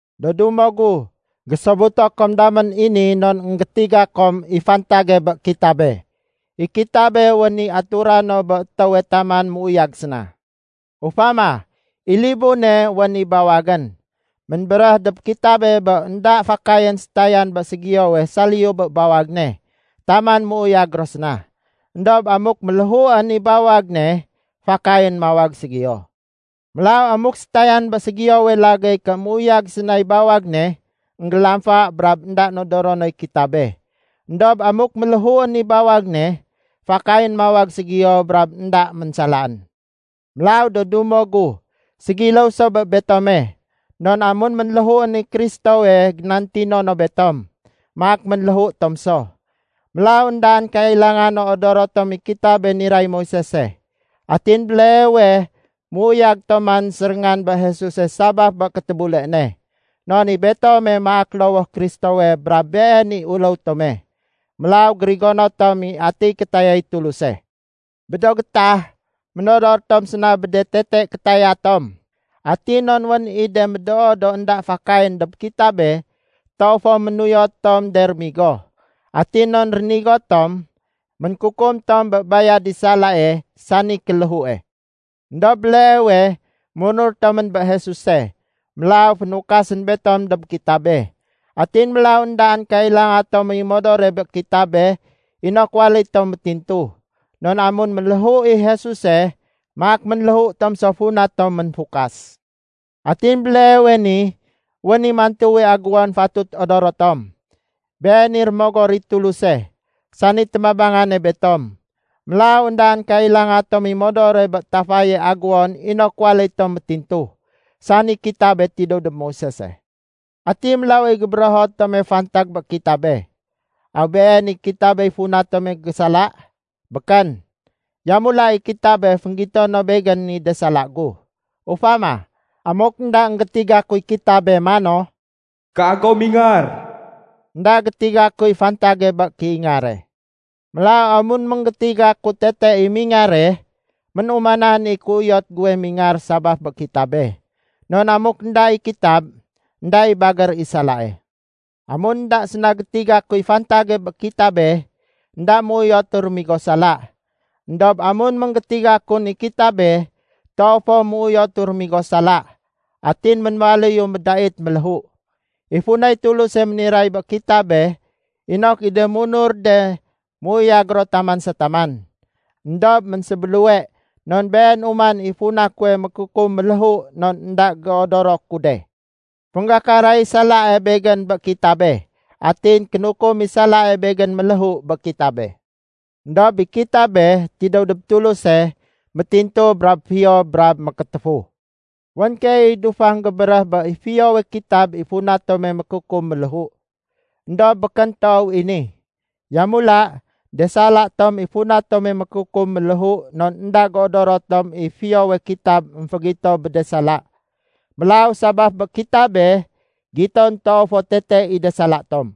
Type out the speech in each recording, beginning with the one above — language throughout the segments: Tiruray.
Do dumo gu, gésobuto kom damén i ni non énggétiga kom i fantage bé kitabe. I kitabe wén i atura no bé étéwe taman méuyag séna. Ufama, i libune wén i bawagén. Ménbéréh dob kitabe bé énda fakayén sétayan bé ségiyowe saliyu bé bawag ne taman méuyag ro séna. Endob amuk ménléhuén i bawag ne, fakayén mawag ségiyo. Mélaw amuk sétayan bé ségiyowe lagéy ké méuyag sénay bawag ne, énggélamfa brab énda nodoro noy kitabe. Endob amuk ménléhuén i bawag ne, fakayén mawag ségiyo brab énda ménsalaén. Mélaw do dumo gu, ségiléw so bé betome, non amun ménléhuén i Kristowe génantino no betom, maak ménléhu tom so. Mélaw éndaén kailanga no odoro tom i kitabe niray Moisese. Atin béleewe méuyag tom man séréngan bé Jesuse sabaf bé kétébule ne. Non i betome maak lowoh Kristowe brab Been i uléw tome. Mélaw gérigono tom i atiy kétayay Tuluse. Bé do gétah, ménodor tom séna bé de tete kétaya tom. Atin non wén i de médoo do énda fakayén dob kitabe, toow fo ménuyot tom de rémigo. Atin non rénigo tom, ménkukum tom bé bayad i salae, sani kéléhue. Endob béleewe, munur tomén bé Jesuse, mélaw fénukasén betom dob kitabe. Atin mélaw éndaén kailanga tom i modore bé kitabe inok waléy tom métintu, non amun ménléhu i Jesuse, maak ménléhu tom so funa tom ménfukas. Atin béleewe ni, wén i mantuwe agéwon fatut odoro tom. Been i Rémogor i Tuluse, sani témabangane betom. Mélaw éndaén kailanga tom i modore bé tafaye agéwon inok waléy tom métintu, sani kitabe tidéw dob Moisese. Ati mélaw i gébérého tome fantag bé kitabe? Aw been i kitabey funa tome gésala? Békén! Yamula, i kitabe, fénggito no begén i de sala gu. Ufama, amuk énda énggétiga kuy kitabe mano, “Kago mingar,” énda gétiga kuy fantage bé kéingare. Mélaw amun énggétiga ku tete i mingare, ménumanan i kéuyot guwe mingar sabaf bé kitabe. Non amuk énda i kitab, énda i bagér i salae. Amun énda séna gétiga kuy fantage bé kitabe, énda méuyotu rémigo sala. Endob amun énggétiga kun i kitabe, toow fo ménuyotu rémigo sala, atin ménwaléyu médait méléhu. I funay Tuluse méniray bé kitabe, inok i de munur de méuyag ro taman sa taman. Endob ménsébéluwe non been uman i funa kuwe mékukum méléhu non énda géodoro ku de. Fénggakaray salae begén bé kitabe, atin kénukum i salae begén méléhu bé kitabe. Endob i kitabe, tidéw dob Tuluse, brab métintu brab fiyo brab mékétéfu. Wén keey i dufang gébéréh bé i fiyowe kitab i funa tome mékukum méléhu. Endob békén toow i ni. Yamula, de sala tom i funa tome mékukum méléhu non énda géodoro tom i fiyowe kitab émfégito bé de sala. Mélaw sabaf bé kitabe, giton toow fo tete i de sala tom.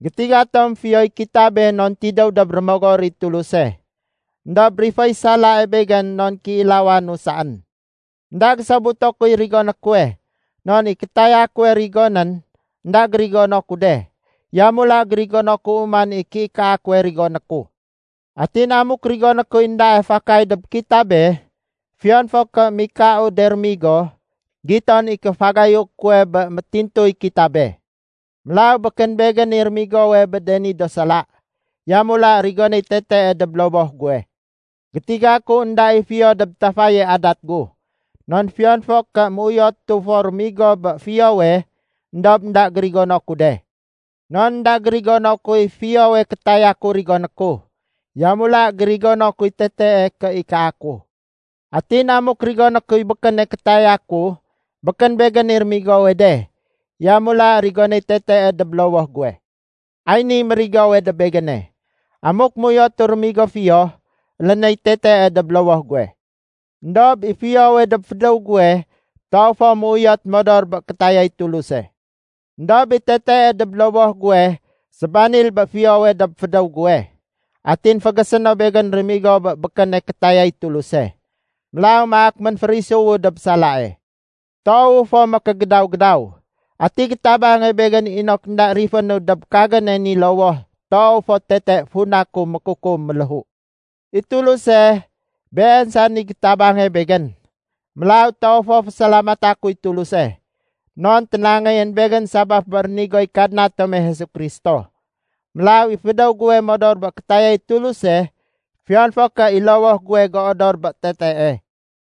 Gétiga tom fiyoy kitabe non tidéw dob Rémogor i Tuluse. Endob riféy salae begén non kéilawanu saén. Enda gésobuto kuy rigoné kuwe. Non i kétaya kuwe rigonén, énda gérigono ku de. Yamula gérigono ku uman i kéikaa kuwe rigoné ku. Atin amuk rigoné kuy éndae fakay dob kitabe, fiyon fo ké mikau de rémigo, giton i kéfagayu kuwe bé métintuy kitabe. Mélaw, békén begén i rémigowe bé de ni do sala. Yamula rigonéy tetee dob lowoh guwe. Gétiga ku énda i fiyo dob tafaye adat gu. Non fiyon fo ké méuyotu fo rémigo bé fiyowe, éndob énda gérigono ku de. Non énda gérigono kuy fiyowe kétaya ku rigoné ku. Yamula gérigono kuy tetee kéikaa ku. Atin amuk rigoné kuy békéne kétaya ku, békén begén i rémigowe de. Yamula rigonéy tetee dob lowoh guwe. Ay niy mérigowe dob begéne. Amuk méuyotu rémigo fiyo, élénéy tetee dob lowoh guwe. Endob i fiyowe dob fédéw guwe toow fo méuyot modor bé kétayay Tuluse. Endob i tetee dob lowoh guwe sébanil bé fiyowe dob fédéw guwe. Atin fégésé no begén rémigo bé békéne kétayay Tuluse. Mélaw maak ménférisuwu dob salae. Toowu fo mékégédaw-gédaw. Ati gétabange begén inok énda rifénu dob kagéne ni lowoh toow fo tete funa ku mékukum méléhu? I Tuluse, Been saén i gétabange begén. Mélaw toow fo fésalamata kuy Tuluse! Non ténangéyén begén sabaf bé rénigoy Kadna tome Jesu Kristo. Mélaw i fédéw guwe modor bé kétayay Tuluse, fiyon fo ké i lowoh guwe géodor bé tetee.